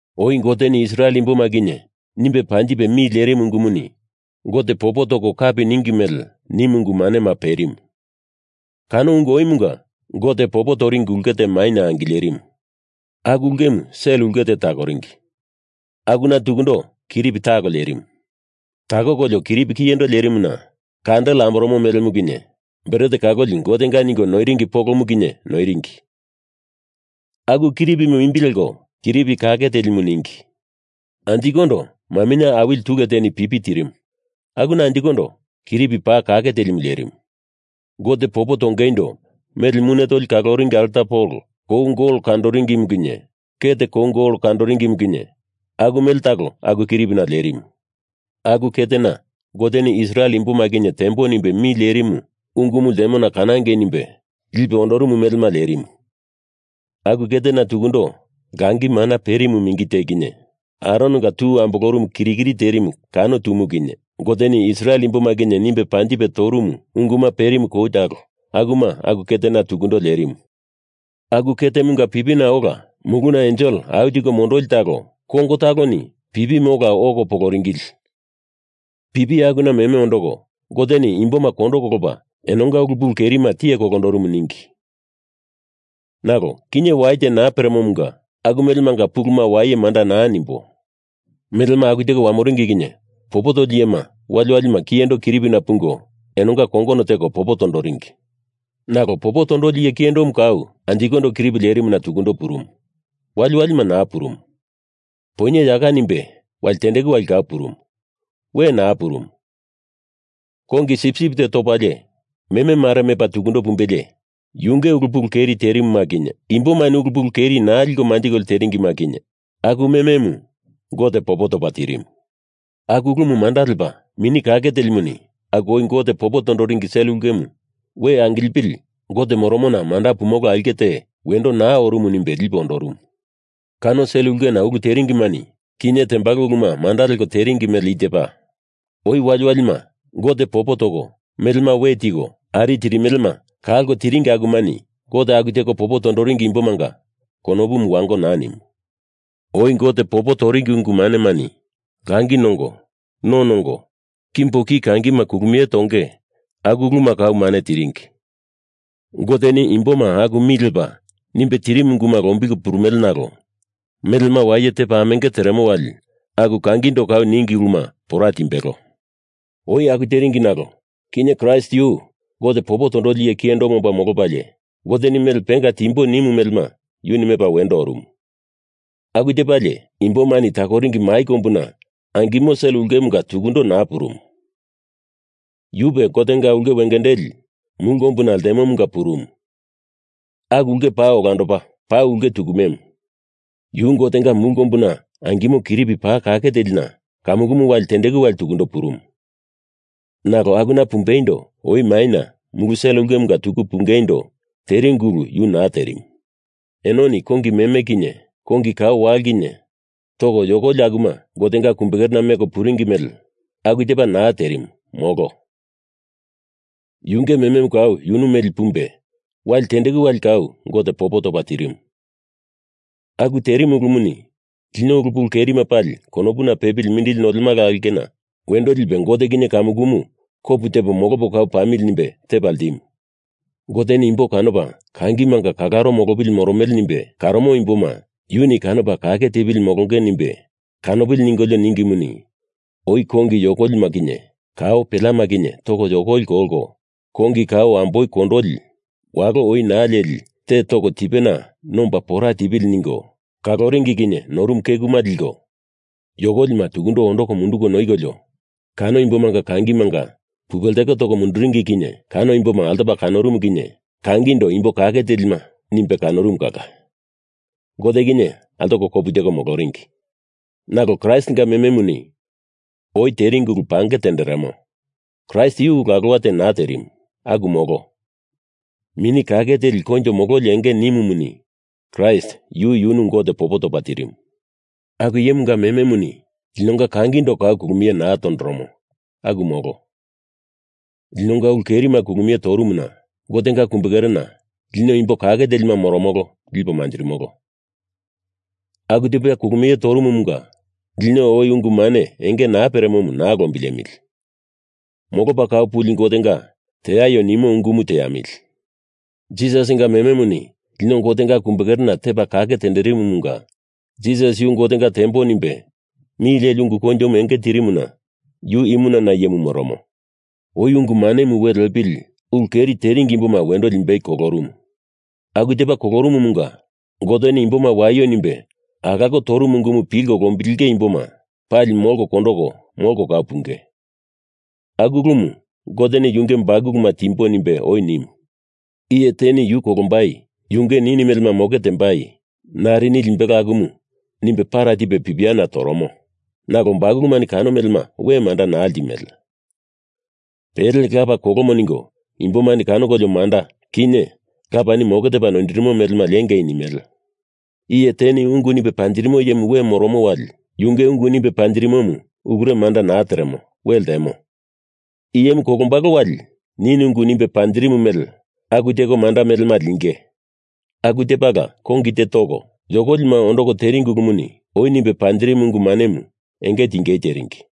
Oi Goteni Israel imboma kinye nimbe panjipe mi lerimu ungumuni Gote popo toko kapi ninge mele nimu ungu manema perimu. Kano ungu oimunga Gote popo toringi ulke te maina angilerimu. Aku ulkemu sel ulke te takoringi, akuna tukundo kiripi talo lerimu. Takokolio, kiripi kiyendo lerimuna kandel amboromo melemu kinye bret kaloli Gotenga ningo noiringi polomu kinye noiringi, aku kiripimu imbi leko Kiripi Kake Telimu ningi. Anjikondo maminye awili tule teni pipi tirimu akuna anjikondo Kiripi Paa Kake Telimu lerimu. Gote popo tongeindo mele mune tolima kaloringi alta polo kou gol kandoringimu kinye ket kou gol kandoringimu kinye aku mele talo aku kiripina lerimu. Aku ketena Goteni Israel imboma kinye tembo nimbe mi lerimu ungumu ltemona kanangei nimbe lipe ondorumu melema lerimu. Aku ketena tukundo langi mana perimu mingi te kinye Arononga tu ambolorumu kirikiri terimu kano tumu kinye Goteni Israel imboma kinye nimbe panjipe torumu unguma perimu kou talo akuma aku ketena tukundo lerimu. Aku ketemunga pipina ola muluna ensel au tiko mondoli talo kongo taloni pipimu ola oko poloringili pipi akuna meme ondoko Goteni imboma kondo kolopa enonga ulu pulu kerima tiye kolondorumu ningi. Nalo kinye wai te naa peremomunga aku melemanga puluma waye manda naa nimbo. Melema aku teko wamoringi kinye popo toli iyema wali walima kiyendo kiripina pungo enonga kongono teko popo toringi. Nalo popo tondoli iye kiyendomu kau anjikondo kiripi lerimuna tukundo purumu. Wali wali naa purumu. Poinye yaka nimbe wali tendeku wali kau purumu. We naa purumu. Kongi sipsip te topalie meme mare mepa tukundo pumbelie yunge ulu pulu keri terimuma kinye imbomani ulu pulu keri naa liko manjiko teringima kinye aku mememu Gote popo topa tirimu. Aku ulumu manda lepa Mini Kake Telimuni aku oi Gote popo toringi sel ulkemu we angilipili Gote moromona manda pumolo aulke te wendo naa orumu nimbe lipe ondorumu. Kano sel ulkena ulu teringimani kinye tembalo uluma manda leko teringi mele i tepa. Oi waliwalima Gote popo toko melema we tiko ari tirimelema kalko tiringi akumani Gote aku teko popo toringi imbomanga konopu wango naa nimu. Oi Gote popo toringi ungu manemani langi nongo, no nongo, kimbo ki kangima kulumie tonge aku uluma kau mane tiringi. Goteni imboma aku mi lepa nimbei tirimu unguma lombilko purumele nalo melema waye tepa amenge teremo wali aku kangindo kau ningi uluma pora timbelo. Oi aku teringi nalo kinye Kraist yu Gote popo tondoli iye kiyendomu omba molopalie Goteni mele pengama timbo nimu melema yuni mepa wendo oromo. Aku tepalie imbomani takoringi mai kombuna angimo sel ulkemunga tukundo naa purumu. Yupe Gotenga ulke wengendeli mulu kombuna ltemomunga purumu. Aku ulke paa olandopa paa ulke tukumemu. Yu Gotenga mulu kombuna angimo kiripi paa kake telina kamukumu wali tendeku wali tukundo purumu. Nalo akuna pumbeindo oi maina mulu sel ulkemunga tuku pungeindo teringi ulu yu naa terimu. Enoni kongi meme kinye kongi kao walo kinye toko yokoli akuma Gotenga kumbekerena meko puringi mele aku tepa naa terimu, molo. Yunge mememu kau yunu meli pumbe wali tendeku wali kau Gote popo topa tirimu. Aku terimu ulumuni lino ulu pulu keri pali konopuna pepili mindili nolemala aulkena wendo lipe Gote kinye kamukumu kopu tepo molopo kau pamili nimbe tepa ltimu. Goteni imbo kanopa kangimanga kalaro molopili moromele nimbe karomo imboma yuni kanopa kake tepili molonge nimbe kanopili ningolio ningimuni, oi kongi yokolima kinye kao peleama kinye toko yokolima kolko, kongi kao amboi kondoli, walo oi naa leli te toko tipena nomba pora tipili ningo kaloringi kinye norumu kekuma liko, yokolima tukundo ondoko munduko noikolio, kano imbomanga kangimanga pupe lteko toko munduringi kinye kano imboma altopa kanorumu kinye kangindo imbo kake telima nimbe kanorumu kala Gote kinye altoko kopu teko moloringi. Nalo Kraistinga mememuni oi teringi ulu pange tenderemo. Kraist yu ulu alowa te naa terimu. Aku molo. Mini Kake Teli Koinjo Mololi enge nimumuni Kraist yu yunu Gote popo topa tirimu. Aku iyemunga mememuni linonga kangindo kau kulumie naa tondoromo. Aku molo. Linonga ulu kerima kulumie torumuna Gotenga kumbekerena lino Imbo Kake Telima moromolo lipo manjirimolo. Aku tepa kulumie torumumunga lino oi ungu mane enge naa peremomu naa lombilemili. Molopa Kau Puli Gotenga teaio nimu ungumu teamili. Jisasinga mememuni lino Gotenga kumbekerena tepa kake tenderimumunga Jisas yu Gotenga tembo nimbe mi leli ungu koinjomu enge tirimuna yu imunana iyemu moromo. Oi ungu manemu we lepili ulu keri teringi imboma wendo limbei kolorumu. Aku tepa kolorumumunga Goteni imboma waio nimbe alako torumu ungumu pilko lombilenge imboma pali molko kondoko molko kau punge. Aku ulumu Goteni yunge bakuluma timbo nimbe oi nimu. Iye teni yu kolombai yunge nini melema moke tembai narini limbelo akumu nimbe para tipe pipiana toromo. Nalo bakulumani kano melema we manda naa limele. Pele lapa kolomo ningo imbomani kanokolio manda, kinye lapani moke tepa noindirimo melema liengei nimele. Iye teni ungu nimbe panjirimo iyemu we moromo wali yunge ungu nimbe panjirimomu ulure manda naa teremo, we ltemo. Iyemu kolombalo wali nini ungu nimbe panjirimu mele aku teko manda melema linge. Aku tepala kongi te toko yokolima ondoko teringi ulumuni oi nimbe panjirimu ungu manemu enge tingei teringi.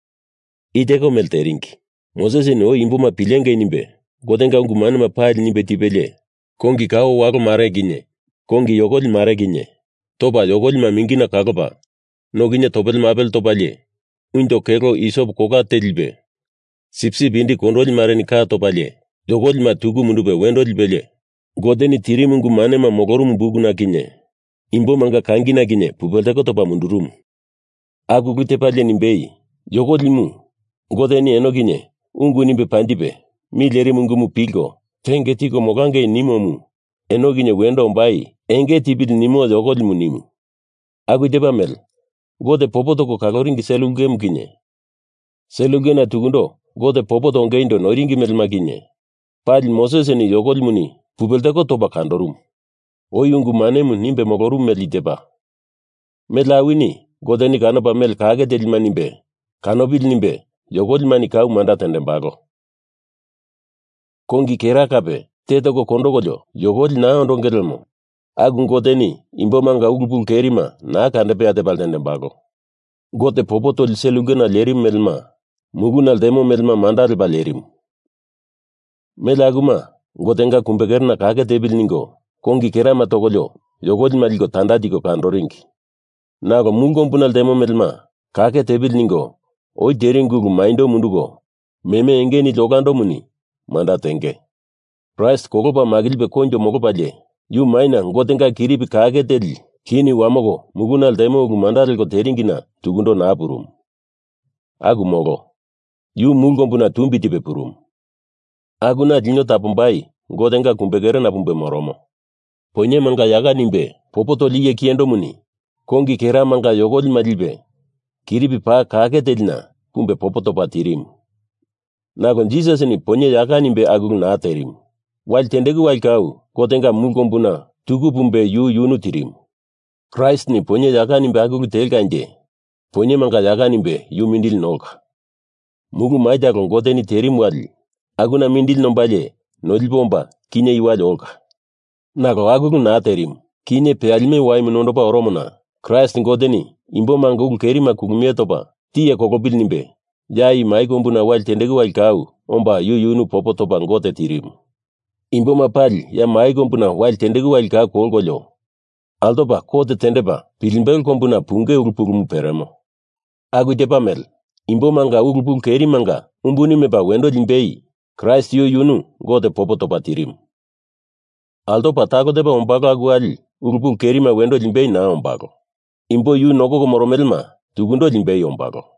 I teko mele teringi: Mosesini oi imboma pilengei nimbe Gotenga ungu manema pali nimbe tipelie kongi kao walo mare kinye kongi yokoli mare kinye topa yokolima mingina kolopa, no kinye topele mapele topalie, unjo kelo isop kola te lipe sipsip indi kondoli mareni ka topalie, yokolima tuku mundupe wendo lipelie Goteni tirimu ungu manema molorumu bukuna kinye imbomanga kangina kinye pupe lteko topa mundurumu. Aku ulu tepalie nimbei, yokoli imu Goteni eno kinye ungu nimbe panjipe mi lerimu ungumu pilko tenge tiko molangei nimomu eno kinye wendo ombai enge tipili nimo yokolimu nimu. Aku tepa mele Gote popo toko kaloringi sel ulkemu kinye sel ulkena tukundo Gote popo tongeindo noiringi melema kinye pali Mosesini yokolimu pupe lteko topa kandorumu. Oi ungu manemu nimbe molorumu mele i tepa: Mele awini Goteni kanopa mele kake telima nimbe kanopili nimbe yokolimani kau manda tendembalo. Kongi kera kape te toko kondokolio yokoli naa ondonge lemo aku Goteni imbomanga ulu pulu kerima naa kandepea tepa ltendembalo. Gote popo toli sel ulkena lerimu melema muluna ltemo melema manda lepa lerimu. Mele akuma Gotenga kumbekerena kake tepili ningo kongi kerama tokolio yokolima liko tanda tiko kandoringi. Nalo mulu kombuna ltemo melema kake tepili ningo oi teringi ulu maindo munduko meme enge nili olandomuni manda tenge. Kraist kolopa makilipe koinjo molopalie ya maina Gotenga kiripi kake teli kini wamoko muluna ltemo ulke manda leko teringina tukundo naa purumu. Aku molo. Yu mulu kombuna tumbi tipe purumu. Akuna lino tapombai Gotenga kumbekerena pumbe moromo. Poinyemanga yaka nimbe popo toli iye kiyendomuni kongi kera manga yokolima lipe kiripi paa kake telina pumbe popo topa tirimu. Nalo Jisasini poinye yaka nimbe aku ulu naa terimu. Wali tendeku wali kau Gotenga mulu kombuna tuku pumbe yu yunu tirimu. Kraistini poinye yaka nimbe aku ulu telkanje poinyemanga yaka nimbe yu mindili nolka. Mulu mai talo Goteni terimu wali akuna mindili nombalie nolipe omba kinye i wali olka. Nalo aku ulu naa terimu. Kinye peyalime waimu nondopo oromona Kraist Goteni imbomanga ulu kerima kulumie topa tiye kolopili nimbe ya i mai kombuna wali tendeku wali kau omba yu yunu popo topa Gote tirimu. Imboma pali ya maina wali tendeku wali kau kolkolio altopa kot tendepa pilimbelo kombuna punge ulu pulumu peremo. Aku tepa mele imbomanga ulu pulu kerimanga umbuni mepa wendo limbei Kraist yu yunu Gote popo topa tirimu. Altopa talo tepa ombalo aku wali ulu pulu kerima wendo limbei naa ombalo. Imbo yu nokoko moromelema tukundo limbei ombalo.